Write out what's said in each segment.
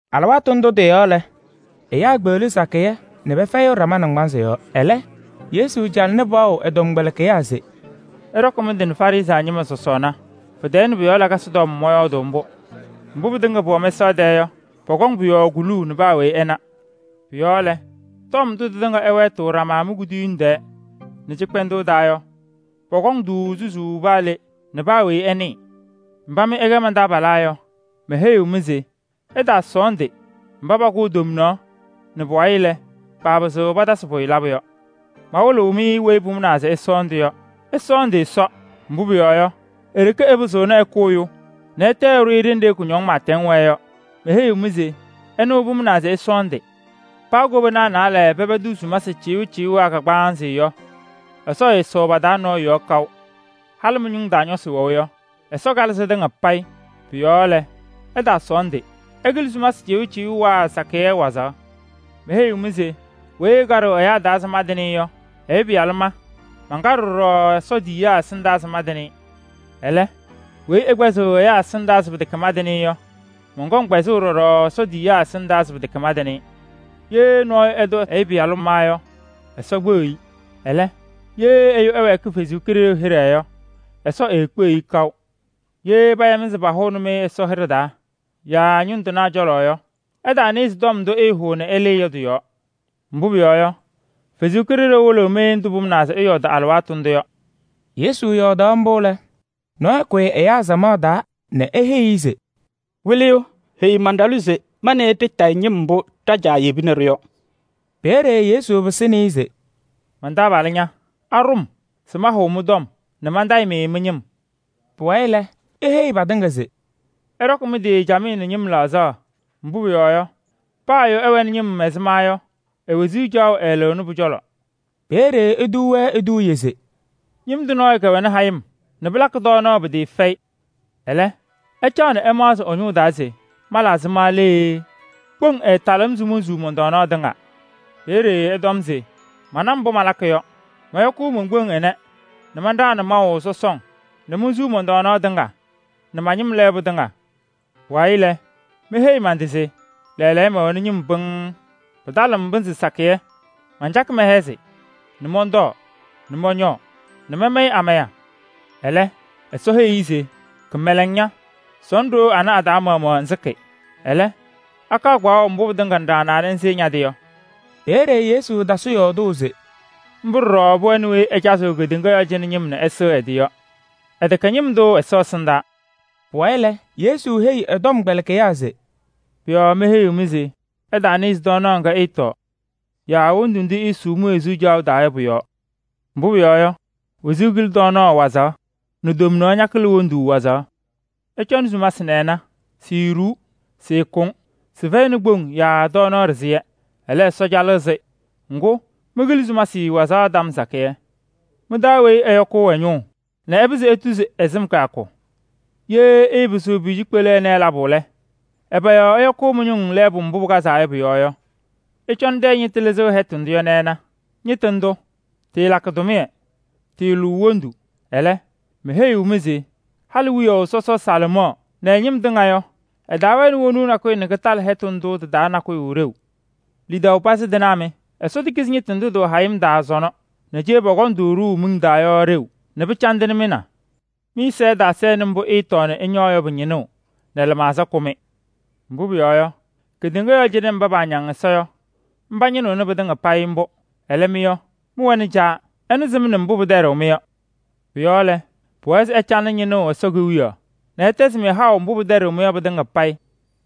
Alɩwaatʋ ndʋ tɩ-yɔɔ lɛ, ɛyaa kpeɣli kamaɣ fɛyɩ nɛ pɛfɛyɩɣ ɖama naŋgbanzɩ yɔɔ. Ɛlɛ Yesu calɩnɩ paɣʋ ɛ-tɔmkpɛlɩkɩyaa se: “Ɩɖɔkɩ mɩ-tɩ nɛ Farɩsɩ ñɩma sɔsɔɔna. Pɛ-tɛɛ nɛ pʋ-yɔɔ lakasɩ tɔm mɔyɔɔdʋʋ mbʋ. Mbʋ pɩtɩŋa pʋwɛ mɛsaɣ tɛɛ yɔ, pɔkɔŋ pʋ-yɔɔ kuluu nɛ paa weyi ɛna. Pʋ-yɔɔ lɛ, tɔm ndʋ tɩtɩŋa ɩwɛɛtɩɣ ɖama mi-kuduyiŋ tɛɛ nɛ cɩkpɛndʋʋ taa yɔ, pɔkɔŋ-tʋ susuu paa le nɛ paa weyi ɛnɩɩ.” “Mba mɩ ɩkɛ man-taabalaa yɔ, meheyiɣ-mɩ se ɩtaasɔɔndɩ mba pakʋʋ tomnaɣ nɛ pʋwayɩ lɛ, paapɩzɩɣ patasɩ pʋyʋ labʋ yɔ. Mawɩlɩɣ-mɩ weyi pʋmʋnaa se ɩsɔɔndɩ yɔ: ɩsɔɔndɩ Ɛsɔ, mbʋ pʋyɔɔ yɔ, e-ɖeke ɛpɩzɩɣna ɛkʋ ɛyʋ nɛ ɛtɛ ɛɖʋ-ɩ ɖenɖe kʋñɔŋ pɩɩtɛŋ wɛɛ yɔ. Meheyiɣ-mɩ se ɛnʋ pʋmʋnaa se ɩsɔɔndɩ. Paa kobanaa naalɛ pɛpɛdɩɣ sumasɩ cɩʋcɩʋwaa kagbaanzɩ yɔ, Ɛsɔ ɛɛsɔʋ pa-taa nɔɔyʋ yɔɔ kaʋ. Halɩ mɩ-ñʋŋ taa ñɔsɩ wɛʋ yɔ, Ɛsɔ kalɩ sɩtɩŋa payɩ. Pʋ-yɔɔ lɛ, ɩtaasɔɔndɩ. Ɩkɩlɩ sumasɩ cɩʋcɩʋwaa sakɩyɛ wazaɣ.” “Meheyiɣ-mɩ se weyi ɛkaɖɩɣ ɛyaa taa se mantɩnɩ-ɩ yɔ, Ɛyʋ Pɩyalʋ ma mankaɖɩɣ ɖɔɖɔ Ɛsɔ tiyiyaa ɛsɩndaa se mantɩnɩ-ɩ. Ɛlɛ, weyi ɛkpɛzɩɣ ɛyaa ɛsɩndaa se pɩtɛkɛ mantɩnɩ-ɩ yɔ, mɔnkɔŋ kpɛzʋʋ ɖɔɖɔ Ɛsɔ tiyiyaa ɛsɩndaa se pɩtɛkɛ mantɩnɩ-ɩ. Ye nɔɔyʋ ɛtʋ Ɛyʋ Pɩyalʋ ma yɔ, Ɛsɔ kpeɣiɣ-i. Ɛlɛ, ye ɛyʋ ɛwɛɛkɩ Ɛsɔ Kalɩzaɣ hɩɖɛ yɔ, Ɛsɔ eekpeɣiɣ-i kaʋ. Ye paya-mɩ se pahʋʋnɩ-mɩ Ɛsɔ ɖɩsɛyɛ taa yaa ñʋŋ tɩnaa cɔlɔ yɔ, ɩtaanɩɣzɩ tɔm ndʋ ɩɩhʋʋ nɛ ɩlɩɩ yɔ tɩ-yɔɔ. Mbʋ pʋyɔɔ yɔ, Ɛsɔ Kalɩzaɣ wɩlɩɣ-mɩ ndʋ pʋmʋnaa se ɩyɔɔdɩ alɩwaatʋ ndʋ yɔ.” Yesu yɔɔdaɣ mbʋ lɛ, nɔɔyʋ kʋyɩ ɛyaa samaɣ taa nɛ eheyi-i se: “Wɩlɩyʋ! Heyi man-ɖalʋ se ma nɛ ɩ ɖɩtayɩ ñɩm mbʋ ɖa-caa yebini-ɖʋ yɔ.” Peeye Yesu pɩsɩnɩ-ɩ se: “Man-taabalʋ ña! Aɖʋ-m se mahʋʋ mɩ-tɔm nɛ mantayɩ-mɩ mɩ-ñɩm?” Pʋwayɩ lɛ, eheyi patɩŋa se: “Ɩɖɔkɩ mɩ-tɩ camɩyɛ nɛ ñɩm laɣzaɣ. Mbʋ pʋyɔɔ yɔ, paa ɛyʋ ɛwɛnɩ ñɩm ɛzɩma yɔ, e-wezuu caɣʋ ɛɛlɩɣnɩ pʋ-cɔlɔ.” Peeye etuu-wɛ eduuye se: “Ñɩm tʋ nɔɔyʋ kɛwɛnɩ hayɩm nɛ pɩlakɩ tɔɔnaɣ pɩtɩɩfɛyɩ. Ɛlɛ, ɛcaɣ nɛ ɛmaɣzɩ ɛ-taa se: ‘Mala ɛzɩma lee? Kpoŋ ɛɛtalɩɣ-m se monsuu mɔn-tɔɔnaɣ tɩŋa.’ Peeye ɛtɔm se: ‘Mana mbʋ malakɩ yɔ. Mɔyɔkʋʋ mon-kpoŋ ɩnɛ nɛ manɖaɣnɩ maʋ sɔsɔŋ nɛ monsuu mɔn-tɔɔnaɣ tɩŋa nɛ ma-ñɩm lɛɛbʋ tɩŋa. Pʋwayɩ lɛ, meheyi man-tɩ se: lɛɛlɛɛyɔ mɛwɛnɩ ñɩm pɩŋŋ, pɩtalɩɣ-m pɩnzɩ sakɩyɛ. Mancakɩ mɛhɛzɩ nɛ mɔntɔɔ nɛ mɔñɔɔ nɛ mamayɩ amaya.’ Ɛlɛ, Ɛsɔ heyi-i se: ‘Kɩmɛlɛŋ ña! Sɔnɔ ɖoo anɛ a-taa maɣmaɣ ŋsɩkɩ. Ɛlɛ akaɣ kpaɣʋ mbʋ pɩtɩŋa ŋɖaɣnaa nɛ ŋsɩɩ ña-tɩ yɔ?’” Peeye Yesu tasɩ yɔɔdʋʋ se: “Mbʋ ɖɔɖɔ pʋwɛnɩ weyi ɛcazɩɣ kedeŋa yɔɔ cɩnɛ ñɩm nɛ ɛsɩɣ ɛ-tɩ yɔ. Ɛtɛkɛ ñɩm tʋ Ɛsɔ ɛsɩndaa.” Pʋwayɩ lɛ, Yesu heyi ɛ-tɔmkpɛlɩkɩyaa se: “Pʋ-yɔɔ meheyiɣ-mɩ se ɩtaanɩɣzɩ tɔɔnaɣ ŋga ɩɩtɔɔ yaa wondu ndʋ iisuu mi-wezuu caɣʋ taa yɔ pʋ-yɔɔ. Mbʋ pʋyɔɔ yɔ, wezuu kɩlɩ tɔɔnaɣ wazaɣ nɛ tomnaɣ ñakɩlɩ wondu wazaɣ. Ɩcɔnɩ sumasɩ nɛ ɩna: siiɖuu, sɩɩkʋŋ. Sɩfɛyɩnɩ kpoŋ yaa tɔɔnaɣ ɖɩzɩyɛ. Ɛlɛ, Ɛsɔ calɩɣ-sɩ. Ŋgʋ, mɩkɩlɩ sumasɩ wazaɣ tɔm sakɩyɛ. Mɩ-taa weyi ɛyɔkʋʋ ɛ-ñʋʋ nɛ ɛpɩzɩ etuzi ɛ-sɩm kɩyakʋ? Ye ɩɩpɩzɩɣ pʋyʋ cikpelu ɛnɛ labʋ lɛ, ɛbɛ yɔɔ ɩyɔkʋʋ mɩ-ñʋŋ lɛɛbʋ mbʋ pɩkazaa yɔ pʋ-yɔɔ yɔ? Ɩcɔnɩ tɛyɛ ñɩtʋ lɩzɩɣ hɛtʋ ndʋ yɔ nɛ ɩna. Ñɩtʋ ndʋ, tɩɩlakɩ tʋmɩyɛ, tɩɩlʋʋ wondu. Ɛlɛ, meheyiɣ-mɩ se halɩ wiyaʋ sɔsɔ Salomɔɔ nɛ ɛ-ñɩm tɩŋa yɔ, ɛtaawɛnɩ wonuu nakʋyʋ nɛ kɩtalɩ hɛtʋ ndʋ tɩ-taa nakʋyʋ ɖeu. Lidaʋ pazɩ tɩnaa mɩ! Ɛsɔ tekizi haʋ ñɩtʋ ndʋ tɩwɛ hayɩm taa sɔnɔ nɛ cee pɔkɔŋ-tʋ ɖʋʋ miŋ taa yɔ ɖeu nɛ pɩcandɩnɩ mɩ na! Mɩ-ɛza ɛtaasɛnɩ mbʋ ɩɩtɔɔ nɛ ɩñɔɔ yɔ pɩ-ñɩnʋʋ nɛ lɩmaɣza kʋ-mɩ. Mbʋ pʋyɔɔ yɔ, keɖeŋa yɔɔ cɩnɛ mba paañaŋ Ɛsɔ yɔ, pañɩnɩɣnɩ pɩtɩŋa payɩ mbʋ. Ɛlɛ mɩ yɔ, mɩwɛnɩ Caa, ɛnʋ sɩmna mbʋ pɩtɛɖɩɣ-mɩ yɔ. Pʋ-yɔɔ lɛ, pʋwɛɛ se ɩcalɩnɩ ñɩnʋʋ Ɛsɔ Kewiyaɣ nɛ ɛtɛzɩ-mɩ haʋ mbʋ pɩtɛɖɩɣ-mɩ yɔ pɩtɩŋa payɩ.”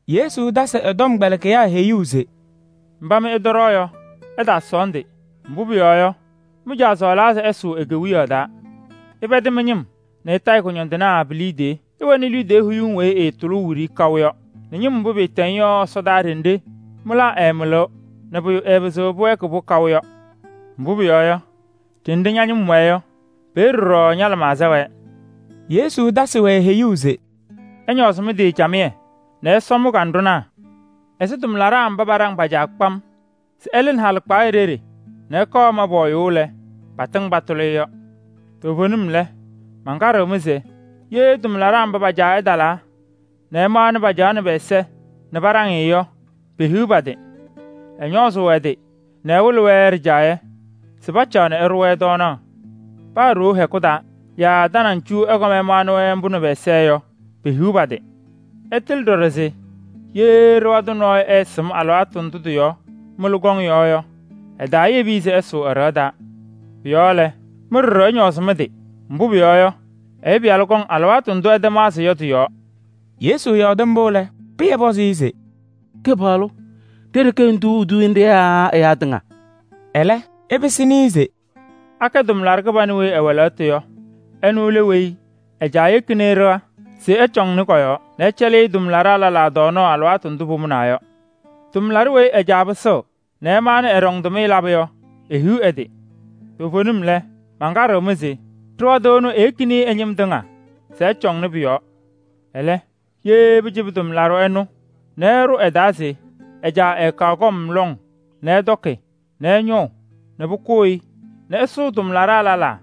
Yesu tasɩ ɛ-tɔmkpɛlɩkɩyaa heyuu se: “Mba mɩ ɩtɔɖɔɔ yɔ, ɩtaasɔɔndɩ. Mbʋ pʋyɔɔ yɔ, mɩ-Caa sɔɔlaa se ɩsʋʋ e-Kewiyaɣ taa. Ɩpɛdɩ mɩ-ñɩm nɛ ɩtayɩ kʋñɔndɩnaa pi-liidiye. Ɩwɛnɩ liidiye huyiŋ weyi ɩɩtʋlʋʋ wiɖiyi kaʋ yɔ nɛ ñɩm mbʋ pɩɩtɛŋ yɔ ɛsɔdaa ɖenɖe mɩlaa ɛɛmɩlɩɣ nɛ pʋyʋ ɛɛpɩzɩɣ pɩwɛɛkɩ-pʋ kaʋ yɔ. Mbʋ pʋyɔɔ yɔ, ɖenɖe ña-ñɩm wɛɛ yɔ, peeye ɖɔɖɔ ña-lɩmaɣza wɛɛ.” Yesu tasɩ-wɛ heyuu se: “Ɩñɔɔzɩ mɩ-tɩ camɩyɛ nɛ ɩsɔ mɩ-kanɖʋnaa ɛzɩ tʋmlaɖaa mba paɖaŋ pa-caa kpam se ɛlɩɣnɩ halɩkpaɣyɛ ɖeɖe nɛ ɛkɔɔ ɛma pɔɔyʋʋ lɛ, patɩŋ patʋlɩ-ɩ yɔ. Toovenim lɛ, mankaɖɩɣ-mɩ se: ye tʋmlaɖaa mba pa-caa ɛtalaa nɛ ɛmaɣnɩ pacaɣnɩ pɛ-ɛza nɛ paɖaŋ-ɩ yɔ, pehiɣ pa-tɩ! Ɛñɔɔzʋʋ ɛ-tɩ nɛ ɛwɩlɩ-wɛ ɖɩjaɣyɛ se pacaɣ nɛ ɛɖʋ-wɛ tɔɔnaɣ. Paa ɖoo hɛkʋ taa yaa tanaŋ cu ɛkɔm ɛmaɣnɩ-wɛ mbʋ nɛ pɛ-ɛza yɔ, pehiɣ pa-tɩ. Ɩtɩlɩ ɖɔɖɔ se ye ɖɩɣa tʋ nɔɔyʋ ɛɛsɩm alɩwaatʋ ndʋ tɩ-yɔɔ mɩlʋ kɔŋ yɔ yɔ, ɛtaayebi-i se ɛsʋʋ ɛ-ɖɩɣa taa. Pʋ-yɔɔ lɛ, mɩ ɖɔɖɔ ɩñɔɔzɩ mɩ-tɩ, mbʋ pʋyɔɔ yɔ, Ɛyʋ Pɩyalʋ kɔŋ alɩwaatʋ ndʋ ɩtamaɣzɩ yɔ tɩ-yɔɔ.” Yesu yɔɔdɩ mbʋ lɛ, Pɩyɛ pɔzɩ-ɩ se: “Kɩpaɣlʋ! Ɖe-ɖeke ŋtuu eduuye nɖɩ yaa ɛyaa tɩŋa?” Ɛlɛ ɛpɩsɩnɩ-ɩ se: “Akɛ tʋmlaɖʋ kɩbanʋ weyi ɛwɛ lɛɣtʋ yɔ? Ɛnʋ lɛ weyi ɛ-caa yekini-i ɖɩɣa se ɛcɔŋnɩ kɔ-yɔɔ nɛ ɛcɛlɩɣ tʋmlaɖaa lɛlaa tɔɔnaɣ alɩwaatʋ ndʋ pʋmʋnaa yɔ. Tʋmlaɖʋ weyi ɛ-caa pɩsɩɣ nɛ ɛmaɣnɩ-ɩ ɛɖɔŋ ɛ-tʋmɩyɛ labʋ yɔ, ehiɣ ɛ-tɩ! Toovenim lɛ, mankaɖɩɣ-mɩ se: ɖɩɣa tʋ ɛnʋ eyekini-i ɛ-ñɩm tɩŋa se ɛcɔnɩ pʋ-yɔɔ. Ɛlɛ, ye pɩcɩbɩ tʋmlaɖʋ ɛnʋ nɛ ɛɖʋ ɛ-taa se ɛ-caa ɛɛkaɣ kɔm lɔŋ nɛ ɛtɔkɩ nɛ ɛñɔʋ nɛ pʋkʋʋ-ɩ nɛ ɛsʋʋ tʋmlaɖaa lɛlaa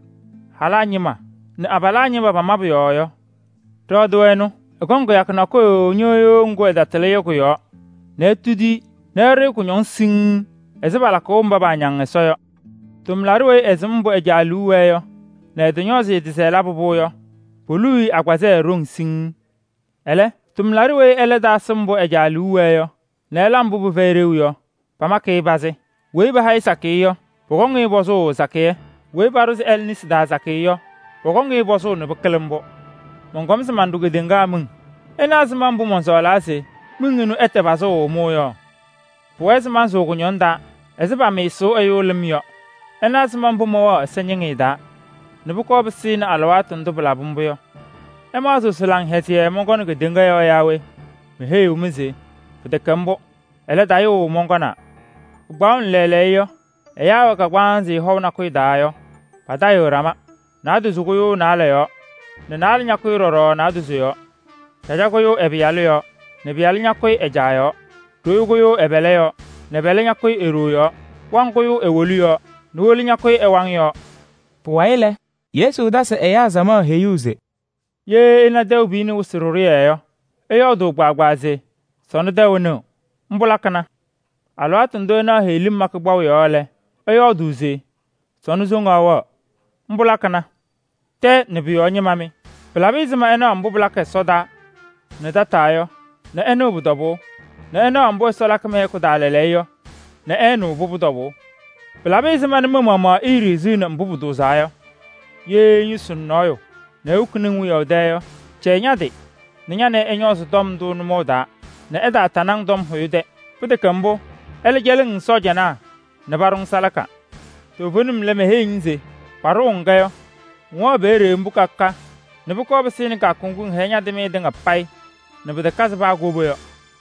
halaa ñɩma nɛ abalaa ñɩma pa-mabʋ yɔɔ yɔ, ɖɩɣa tʋ ɛnʋ, ɛkɔŋ kɩyakʋ nakʋyʋ ñɩɣyʋʋ ŋgʋ ɛtatɩlɩ yɔ kʋ-yɔɔ nɛ etudi-i nɛ ɛɖʋ-ɩ kʋñɔŋ siŋŋ ɛzɩ palakʋʋ mba paañaŋ Ɛsɔ yɔ. Tʋmlaɖʋ weyi ɛsɩm mbʋ ɛ-caa liu wɛɛ yɔ nɛ ɛtɔñɔɔzɩ ɛ-tɩ se ɛlabɩ-pʋ yɔ, poluu-i agbazɛɛ ɖeu siŋŋ. Ɛlɛ, tʋmlaɖʋ weyi ɛlɛ taasɩ mbʋ ɛ-caa liu wɛɛ yɔ nɛ ɛla mbʋ pɩfɛyɩ ɖeu yɔ, pamakɩ-ɩ pazɩ. Weyi paha-ɩ sakɩyɛ yɔ, pɔkɔŋ-ɩ pɔzʋʋ sakɩyɛ. Weyi paɖʋzɩ ɛlɛ nesi taa sakɩyɛ yɔ, pɔkɔŋ-ɩ pɔzʋʋ nɛ pɩkɩlɩ mbʋ.” “Mɔnkɔm se manɖʋ kedeŋa miŋ. Ɩna ɛzɩma mbʋ mɔnsɔɔlaa se ɛtɛ pazʋʋ mʋʋ yɔ? Pʋwɛɛ se mansʋʋ kʋñɔŋ taa ɛzɩ pamɩɩsʋʋ ɛyʋ lɩm yɔ. Ɩna ɛzɩma mbʋ mɛwɛɣ ɛsɛñɩŋɩyɛ taa nɛ pʋkɔɔ pɩsɩnɩ alɩwaatʋ ndʋ pɩlabɩ mbʋ yɔ! Ɩmaɣzɩɣ se laŋhɛzɩyɛ mɔnkɔnɩ kedeŋa yɔɔ yaa we? Meheyiɣ-mɩ se pɩtɛkɛ mbʋ. Ɛlɛ, tayʋʋ mɔnkɔnaa. Pɩkpaɣʋnɩ lɛɛlɛɛyɔ yɔ, ɛyaa ɛwɛ kagbaanzɩ hɔʋ nakʋyʋ taa yɔ, patayɩɣ ɖama: naadozo kʋyʋʋ naalɛ yɔɔ nɛ naalɛ ñakʋyɩ ɖɔɖɔ naadozo yɔɔ. Caja kʋyʋʋ ɛ-pɩyalʋ yɔɔ nɛ pɩyalʋ ñakʋyɩ ɛ-caa yɔɔ. Ɖoyo kʋyʋʋ ɛ-pɛlɛ yɔɔ nɛ pɛlɛ ñakʋyɩ e-ɖoo yɔɔ. Waŋ kʋyʋʋ e-wolu yɔɔ nɛ wolu ñakʋyɩ ɛ-waŋ yɔɔ.” Pʋwayɩ lɛ, Yesu tasɩ ɛyaa samaɣ heyuu se: “Ye ɩna tɛʋ piyini wɩsɩ ɖɩɖʋyɛ yɔ, ɩyɔɔdʋʋ kpaagbaa se: ‘Sɔnɔ tɛʋ nɩɣ,’ mbʋ lakɩna. Alɩwaatʋ ndʋ ɩnaɣ heɣlim makɩ kpaʋ yɔɔ lɛ, ɩyɔɔdʋʋ se: ‘Sɔnɔ soŋaɣ wɛɣ,’ mbʋ lakɩna. Tɛɛ nɛ pʋ-yɔɔ ñɩma mɩ! Pɩlabɩ ɛzɩma ɩnaɣ mbʋ pɩlakɩ ɛsɔdaa nɛ tataa yɔ nɛ ɩnɩɣ pʋ-tɔbʋʋ nɛ ɩnaɣ mbʋ Ɛsɔ lakɩ mɩ-hɛkʋ taa lɛɛlɛɛyɔ yɔ nɛ ɩɩnɩɣ pʋbʋ tɔbʋʋ?” “Pɩlabɩ ɛzɩma nɛ mɩ-maɣmaɣ iiɖiɣziɣni mbʋ pʋtʋʋzaa yɔ? Ye ŋyʋsɩnɩ nɔɔyʋ nɛ ewokini-ŋ wiyaʋ tɛ yɔ, cɛyɩ ña-tɩ nɛ ña nɛ ɩ ɩñɔɔzɩ tɔm ndʋ nʋmɔʋ taa nɛ ɛtaatanɩ-ŋ tɔm hʋyʋ tɛ. Pɩtɛkɛ mbʋ, ɛlɛ cɛlɩɣ-ŋ sɔɔjanaa nɛ paɖʋ-ŋ salaka. Toovenim lɛ, meheyiɣ-ŋ se: paɖʋ-ŋ-kɛ yɔ, ŋwɛɣ peeye mbʋ ka ka nɛ pʋkɔɔ pɩsɩnɩ kɩyakʋ ŋgʋ ŋhɛyɩ ña-kɩmɩyɛ tɩŋa payɩ nɛ pɩtakazɩ paa koba yɔ.”